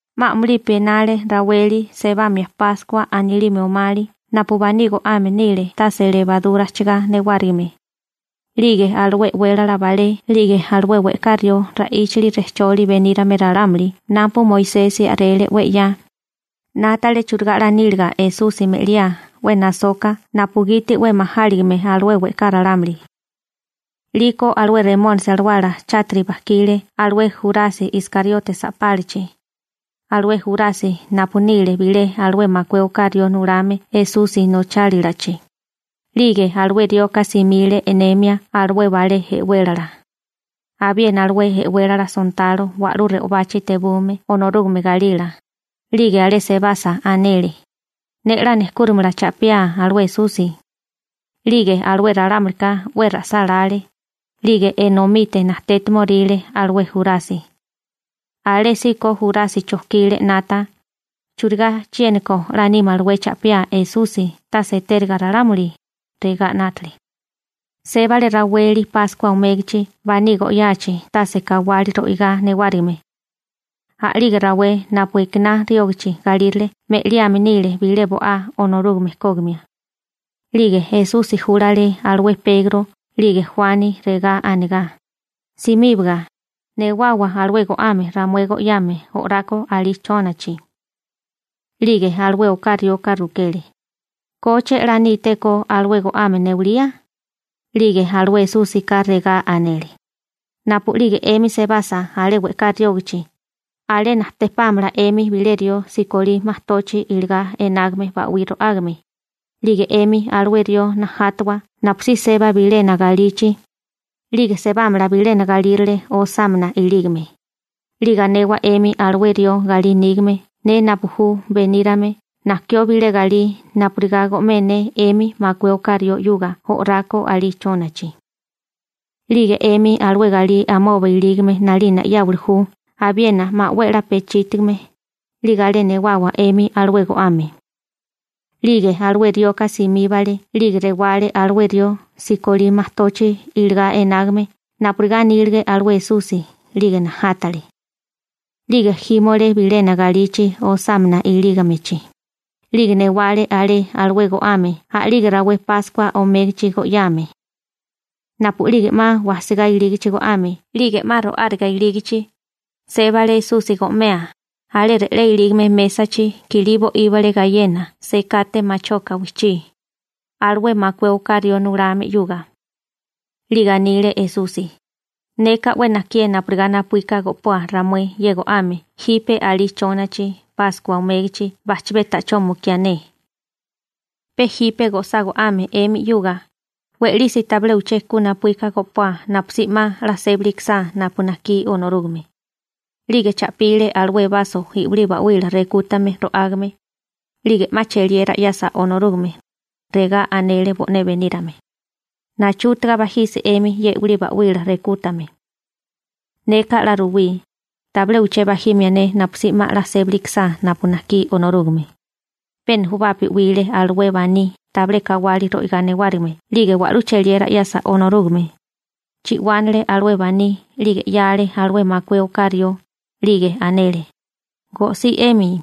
'Ma a'mulipi enale raweli sebamia Páskua anilime omali napu baní go'ame nile tase lebarura ajchigá newárigime, 'lige alué e'wélala balé 'lige alué we'ká rió ra'íchali rejcholi benírame ralámuli napu Moisesi a'rele 'we 'ya, 'nátale churigá 'la níliga Esusi me'liá 'we nasoka napugiti 'we majáligime alué we'ká ralámuli. 'Liko alué Remónisi alawala chátiri bajkile alé Jurasi Iskariote sa'pálachi, alué Jurasi napu nile bilé alué makué oká rió nulame Esusi nochálalachi. 'Lige alué rioka simile e'nemia alué balé e'wélala, abiena alué e'wélala sontalo wa'lú re'obachi tebume Onorúgame galila, 'lige alé sebasa anele: ―Ne 'la nejkúrimala cha'piá alué Esusi. 'Lige alué ralámulika 'we ra'sálále, 'lige enomite najtétimoríle alué Jurasi. Alésíko Jurasi chojkile 'nata: «¿Churigá chiéniko 'la nímalawé cha'piá Esusi tase etériga ralámuli?» regá 'nátale. Sébale raweli Páskua omégachi baní go'yachi tase kawali ro'igá newárigime. A'lige rawé napu ekiná riógachi galírale me'liame nile bilé bo'á Onorúgame kógimia. 'Lige Esusi júlale alué Pegro 'lige Juani, regá anegá: ―Simíbaga, newawa alué go'ame ramué go'yame o'rako alí chónachi. 'Lige alué oká rioka rukele: ―¿Koche 'la nítéko alué go'ame newalía? 'Lige alué Esúsika regá anele: ―Napu'lige 'emi sebasa alé we'ká riógachi, alé najtepámala 'emi bilé rió sikolí majtochi iligá enágame ba'wí ro'ágame, 'lige 'emi alué rió najátawa napusí seba bilena galichi, 'lige sebámala bilena galírale osámana ilígame, 'lige anewa 'emi alué rió galí nígame ne napu ju benírame najkió bilé galí napurigá go'mé ne 'emi makué oká rió 'yuga o'rako alí chónachi. 'Lige 'emi alué galí amoba ilígime 'nalina 'yáwili ju abiena 'ma 'we a'lá pechítigame, 'lige alé newawa 'emi alué go'ame. 'Lige alué rioka simíbale 'lige rewale alué rió sikolí majtochi iligá enágame napurigá anílige alué Esusi 'lige najátale. 'Lige jímole bilena galichi osámana ilígamechi, 'lige newale alé alué go'ame a'lige rawé Páskua omégachi go'yáame. Napu'lige 'ma wajsigá ilígichi go'ame 'lige 'ma ro'áriga ilígichi, sébale Esusi go'mea, alé re'lé ilígame mésachi kilí bo'íbale gayena sekate machoka wijchí, alué makué oká rió nulame 'yuga. 'Lige anile Esusi: ―Neka 'we najkié napurigá napuíka go'poa ramué ye go'ame jipe alí chónachi Páskua omégachi bajchabé ta'chó mukiá ne. Pe jipe go'sá go'ame 'emi 'yuga, we'lisi tabilé uché ku napuíka go'poa napusí 'ma 'la sébali ikisá napu najkí Onorúgame. 'Lige cha'pile alué baso i'wilí ba'wila rekútame ro'ágame, 'lige 'ma cheliera 'yasa Onorúgame, regá anele bo'né benírame: ―Nachútaga bajisi 'emi ye i'wilí ba'wila rekútame. Neka 'la ruwí, tabilé uché bajimia ne napusí 'ma 'la sébali ikisá napu najkí Onorúgame. Pe nujubapi 'wile alué baní tabilé kawali ro'igá newárigime 'lige wa'lú cheliera 'yasa Onorúgame, chi'wánale alué baní 'lige 'yale alué makué oká rió, 'lige anele: ―Go'sí 'emi.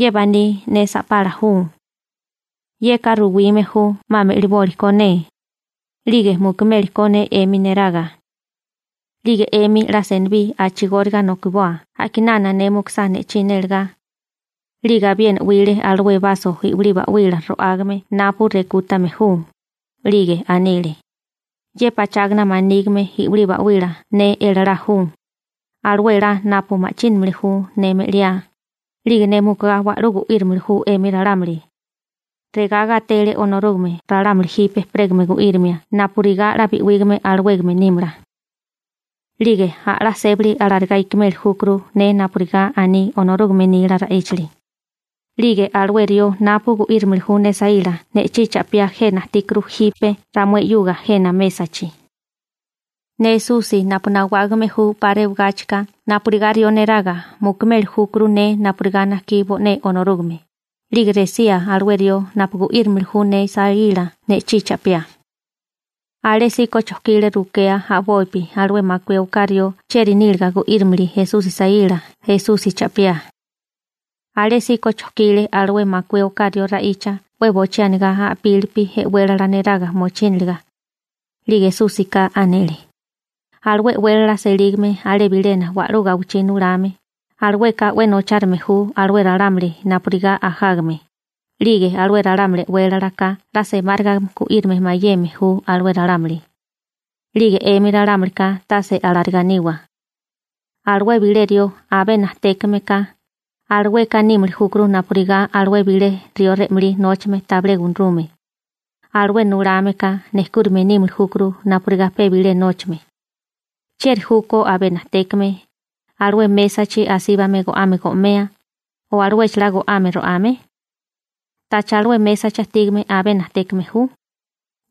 Ye baní ne sa'pala ju. Yeka ruwime ju 'ma me'liboli ko ne, 'lige mukimeli ko ne 'emi neraga. 'Lige 'emi 'la senibí a'chigóriga nokoboa a'kinana ne mukusá ne'chí nélegá. 'Lige abiena 'wile alué baso i'wilí ba'wila ro'ágame napu rekútame ju, 'lige anile: ―Ye pachágana manígime i'wilí ba'wila ne elalá ju, alué elá napu ma'chínamili ju ne me'liá, 'lige ne mukugá wa'lú gu'írimili ju 'emi ralámuli. Regá gatele Onorúgame ralámuli jipe ejperégame gu'írimia napurigá 'la bi'wígame alawégame nímala. 'Lige a'lá sébali alarigá ikimeli júkuru ne napurigá aní Onorúgame nila ra'íchali. 'Lige alué rió napu gu'írimili ju ne saíla ne'chí cha'piá jena ajtíkuru jipe ramué 'yuga jena mésachi. Ne Esusi napu nawágame ju 'pa rewagáchika napurigá rió neraga mukumeli júkuru ne napurigá najkí bo'né Onorúgame, 'lige resía alué rió napu gu'írimili ju ne saíla ne'chí cha'piá. Alésíko chojkile rukea a'bopi alué makué oká rió chieri níliga gu'írimili Esusi saíla Esusi cha'piá. Alésíko chojkile alué makué oká rió ra'icha 'we bochí anigá a'pílipi e'wélala neraga mochíniliga. 'Lige Esúsika anele: ―Alué e'wélala selígame alé bilena wa'lú gawichí nulame, alueka 'we nochárime ju alué ralámuli napurigá ajágame, 'lige alué ralámuli e'wélalaka 'la semáriga gu'írame mayeme ju alué ralámuli. 'Lige 'emi ralámulika tase alarigá niwa. Alué bilé rió abé najtékame ka, alueka nímili júkuru napurigá alué bilé rió re'malí nóchame tabilé gunarume. Alué nulame ka nejkúrime nímili júkuru napurigá pe bilé nóchame. ¿Chieri júkó abé najtékame, alué mésachi asíbame go'ame go'mea, alué chalá go'ame ro'ame? ¿Tacha alué mésachi ajtígame abé najtékame ju?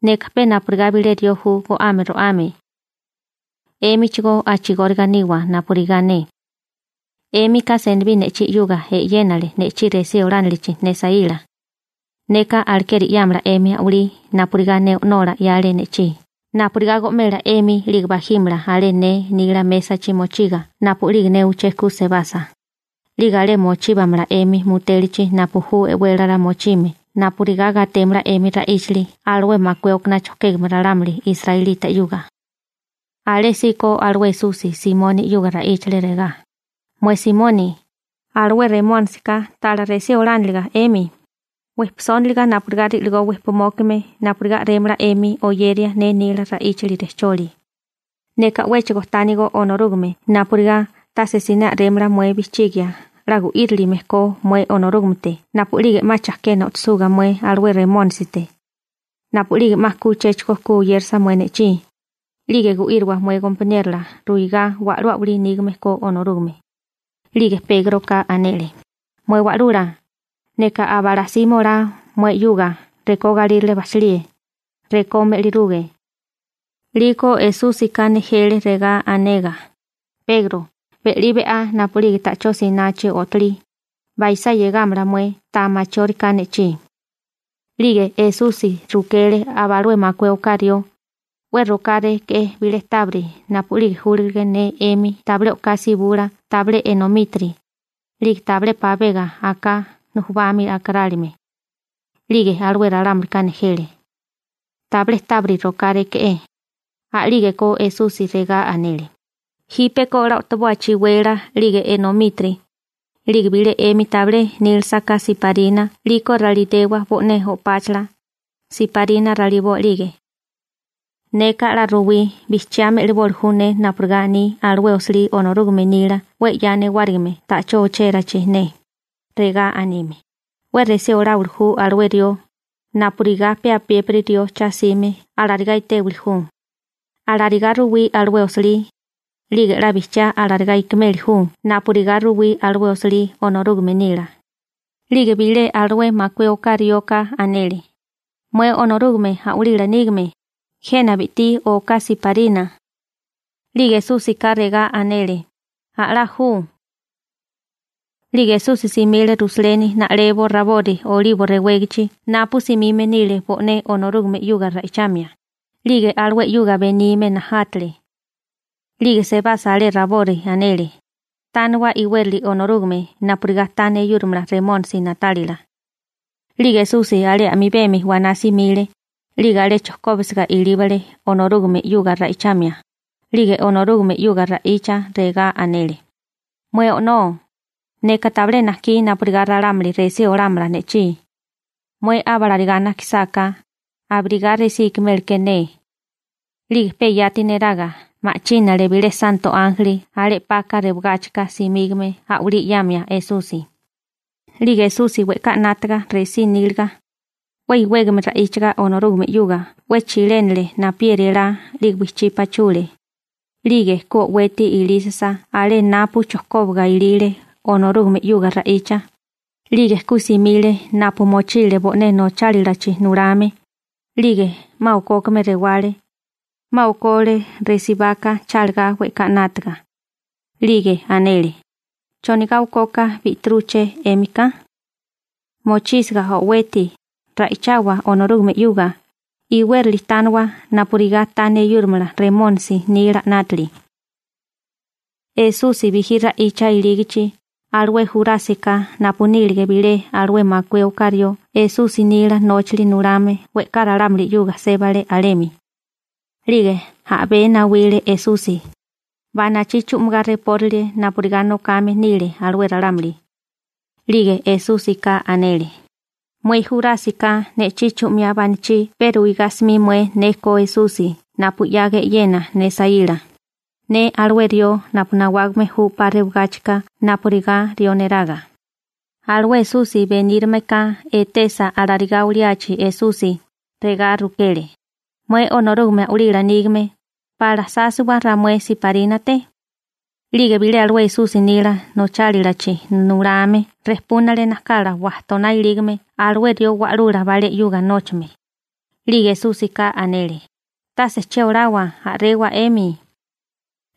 Neka pe napurigá bilé rió ju go'ame ro'ame. 'Émichigó a'chigóriga niwa napurigá ne. 'Émika senibí ne'chí 'yuga e'yénale ne'chí resí olánilichi ne saíla. Neka alekeri 'yámala 'emi a'walí napurigá ne O'nola 'yale ne'chí napurigá go'mela 'emi 'lige bajímala alé ne nila mésachi mochiga napu'lige ne uché ku sebasa, 'lige alé mochíbamala 'emi mutélachi napu ju e'wélala mochime napurigá gatémala 'emi ra'íchali alué makué okaná chojkégame ralámuli israelita 'yuga. Alésíko alué Esusi Simoni 'yuga ra'íchale regá: ―Mué Simoni, alué Remónisika tala resí olániliga 'emi, wejpisóniliga napurigá ri'ligó wejpimókime napurigá a'rémala 'emi oyeria ne nila ra'íchali rejcholi. Neka 'wéchigo tánigo Onorúgame napurigá tase siné a'rémala mué bijchigia 'la gu'írilime ko mué Onorúgamete napu'lige 'ma chajkena o'tosuga mué alué Remónisite. Napu'lige 'ma ku uchéchigo ku oyérasa mué ne'chí, 'lige gu'íriwa mué gompaniérola ruigá wa'lú a'walí nígame ko Onorúgame. 'Lige Pégroka anele: ―Mué Wa'lula, neka aba'lá simé olá mué 'yuga rekó galírale bajchalíe, rekó me'liruge. 'Liko Esúsika nejele regá anegá: ―Pegro, be'lí be'á napu'lige ta'chó sinachi o'tolí, baisá 'yegámala mué ta machióriká ne'chí. 'Lige Esusi rukele aba alué makué oká rió: ―¿'We rokáré bilé tábiri napu'lige júlige ne 'emi tabilé o'ká sibula tabilé enomítiri, 'lige tabilé pabega aká nujubami akarálime? 'Lige alué ralámulika nejele: ―Tabilé tábiri rokáré. A'lígeko Esusi regá anele: ―Jípeko 'la o'toboa chiwela, 'lige enomítiri. 'Lige bilé 'emi tabilé nílasaká siparina 'liko ralinewa bo'né o'páchala, siparina raliboa 'lige. Neka 'la ruwí: Bijchiá me'liboli ju ne napurigá aní alué osilí Onorúgame nila 'we 'ya newárigime ta'chó ochérachi ne, regá anime: «'We resí oláwili ju alué rió, napurigá pe apiépiri rió cha 'sime alarigá etéwili ju.» Alarigá ruwí alué osilí, 'lige 'la bijchiá alarigá ikimeli ju napurigá ruwí alué osilí Onorúgame nila. 'Lige bilé alué makué oká rioka anele: ―Mué Onorúgame a'walila nígame, jena bi'tí oká siparina. 'Lige Esúsika regá anele: ―A'lá ju. 'Lige Esusi simile Rusaleni na'lebo rabori Olibo rewégachi napu simime nile bo'né Onorúgame 'yuga ra'ichamia, 'lige alué 'yuga benime najátale. 'Lige sebasa alé rabori anele: ―Tániwa iwérali Onorúgame napurigá ta neyúrimala Remónisi na'tálila. 'Lige Esusi alé a'mibemi waná simile, 'lige alé chojkóbisiga ilíbale Onorúgame 'yuga ra'ichamia, 'lige Onorúgame 'yuga ra'icha regá anele: ―Mué O'nó, neka tabilé najkí napurigá ralámuli resí olámala ne'chí. Mué abalarigá najkisáká, abirigá resí ikiméleké ne. 'Lige pe yati neraga ma'chínale bilé santo ánjeli alé 'paka rewagáchika simígame a'walí 'yamia Esusi. 'Lige Esusi we'ká 'nátaga resí níliga, 'we iwégame ra'íchaga Onorúgame 'yuga 'we chilénale napieri elá 'lige wijchí pachule. 'Lige ku o'weti ilísisa alé napu chojkóbaga ilile Onorúgame 'yuga ra'icha, 'lige ku simile napu mochile bo'né nochálalachi nulame, 'lige 'ma okókame rewale, 'ma okole resibaka chálagá we'ká 'nátaga. 'Lige anele: ―¿Chonigá okoka bi'tirúché 'émika? Mochísiga o'weti, ra'ichawa Onorúgame 'yuga, iwérili tániwa napurigá ta neyúrimala Remónisi nila 'nátili. Esusi bijí ra'icha ilígichi, alué Jurásika napu nílige bilé alué makué oká rió Esusi nila nóchali nulame we'ká ralámuli 'yuga sébale alemi. 'Lige a'bé nawile Esusi, banachí chu'migá repórile napurigá nokame nile alué ralámuli, 'lige Esúsika anele: ―Mué Jurásika ne'chí chu'miá banachí pe ruigá 'smi mué ne ko Esusi napu 'yaga e'yena ne saíla, ne alué rió napu nawágame ju 'pa rewagáchika napurigá rió neraga. Alué Esusi benírameka etesa alarigá oliachi Esusi, regá rukele: ―Mué Onorúgame a'walila nígame, ¿pala sásiwa ramué siparínate? 'Lige bilé alué Esusi nila nóchalichi nulame rejpúnale najkala wajtoná ilígame alué rió wa'lula balé 'yuga nóchame. 'Lige Esúsika anele: ―¡Tase che olawa, a'rewa 'emi!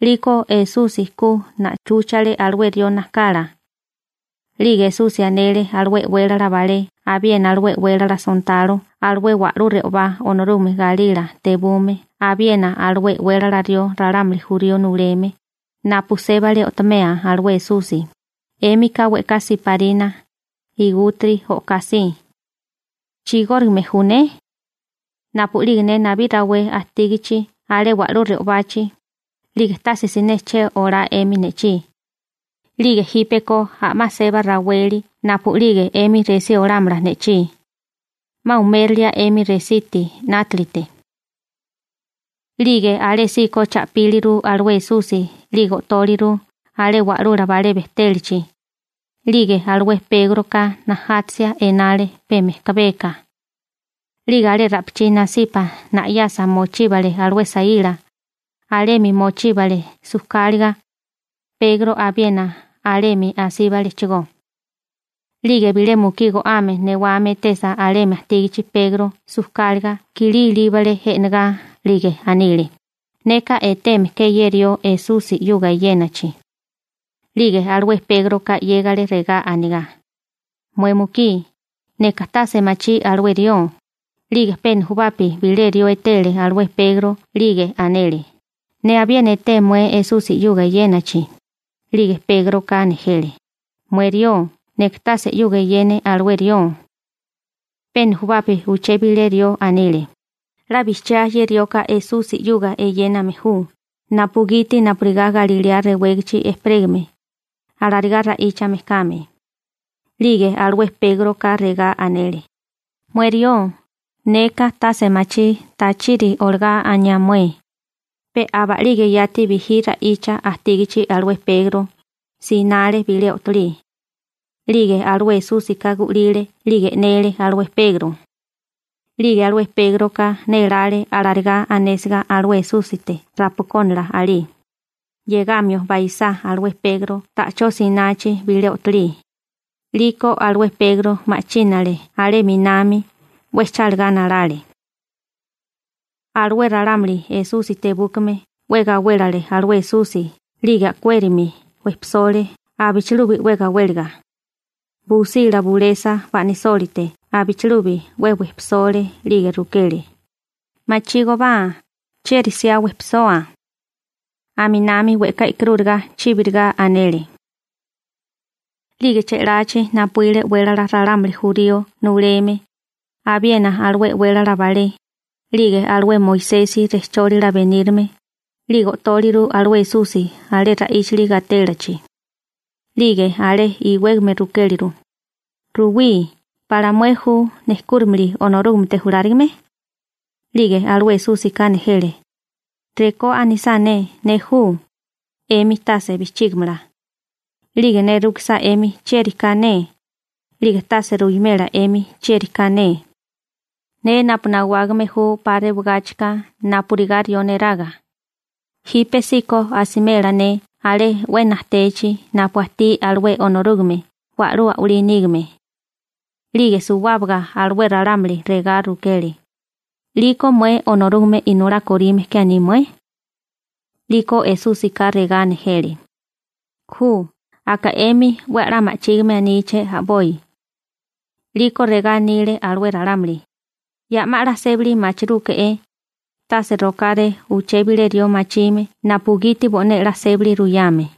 'Liko Esusi ku na'chúchale alué rió najkala. 'Lige Esusi anele alué e'wélala balé abiena alué e'wélala sontalo alué wa'lú re'obá Onorúgame galila tebume abiena alué e'wélala rió ralámuli jurío nuleme, napu sébale o'tomea alué Esusi: ―'Émika we'ká siparina, igútiri o'ká si. ¿Chigórigame ju ne? Napu'lige ne nabí rawé ajtígachi alé wa'lú re'obachi, 'lige tase siné che olá 'emi ne'chí. 'Lige jípeko a'má seba raweli napu'lige 'emi resí olámala ne'chí. 'Ma umérilia 'emi resiti 'nátalite. 'Lige alésíko cha'píliru alué Esusi 'lige o'tóliru alé wa'lula balé bejtélachi. 'Lige alué Pégroka najátasia enale pe mejkabeka. 'Lige alé ra'pichí nasipa na'yasa mochíbale alué saíla, alemi mochíbale sujkáliga, Pegro abiena alemi asíbalechigó. 'Lige bilé mukí go'ame newame etesa alemi ajtígachi Pegro sujkáliga, kilí ilíbale e'negá, 'lige anile: ―Neka eteme ke ye rió Esusi 'yuga eyénachi. 'Lige alué Pégroka 'yégale regá anigá: ―Mué mukí, neka tase machí alué rió. 'Lige pe nujubapi bilé rió etele alué Pegro, 'lige anele: ―Ne abiena eté mué Esusi 'yuga eyénachi. 'Lige Pégroka nejele: ―¡Mué rió, neka tase 'yuga eyene alué rió! Pe nujubapi uché bilé rió anile: ―'La bijchiá ye rioka Esusi 'yuga eyéname ju, napugiti napurigá Galilea rewégachi ejperégame, alarigá ra'íchame kame. 'Lige alué Pégroka regá anele: ―¡Mué rió, neka tase machí tachiri olagá aniá mué! Pe aba'lige yati bijí ra'icha ajtígachi alué Pegro, sinale bilé o'tolí. 'Lige alué Esúsika gu'lile 'lige e'nele alué Pegro. 'Lige alué Pégroka nélále alarigá anésiga alué Esúsite rapakónala alí, 'yegamio baisá alué Pegro ta'chó sinachi bilé o'tolí. 'Liko alué Pegro ma'chínale alé 'minami, 'we chálagá nalale. Alué ralámuli Esusi tebúkame 'we gawélale alué Esusi 'lige a'kuérami chibi olale abichilubi 'we gawéliga. Busila bulesa ba'nasólite abichilubi 'we chibi olale 'lige rukele: ―Machígobá ¿chieri 'siá nejchoa? Aminami we'ká e'karúriga chíbiriga anele. 'Lige che'lachi napuíle e'wélala ralámuli jurío nuleme, abiena alué e'wélala balé, 'lige alué Moisesi rejchólila benírame, 'lige o'tóliru alué Esusi alé ra'íchali gatélichi. 'Lige alé iwégame rukéliru: ―Ruwí: ¿Pala mué ju nejkúrimili Onorúgamete julárigame? 'Lige alué Esúsika nejele: ―Rekó anisá ne «ne ju», 'emi tase bijchígimala, 'lige ne rukisá 'emi chieri ka ne, 'lige tase ruwimela 'emi chieri ka ne. Ne napu nawágame ju 'pa rewagáchika napurigá rió neraga, jípesíko asimela ne alé 'we najtechi napu ajtí alué Onorúgame wa'lú a'walí nígame. 'Lige suwábaga alué ralámuli regá rukele: ―¿'Liko mué Onorúgame Inolá korime ke aní mué? 'Liko Esúsika regá nejele: ―Ju, aka 'emi 'we a'lá ma'chígime aníché a'boi. 'Liko regá anile alué ralámuli: ―Ya 'ma 'la sébali machirúke'é, tase rokáré uché bilé rió machime napugiti bo'né 'la sébali ruyame.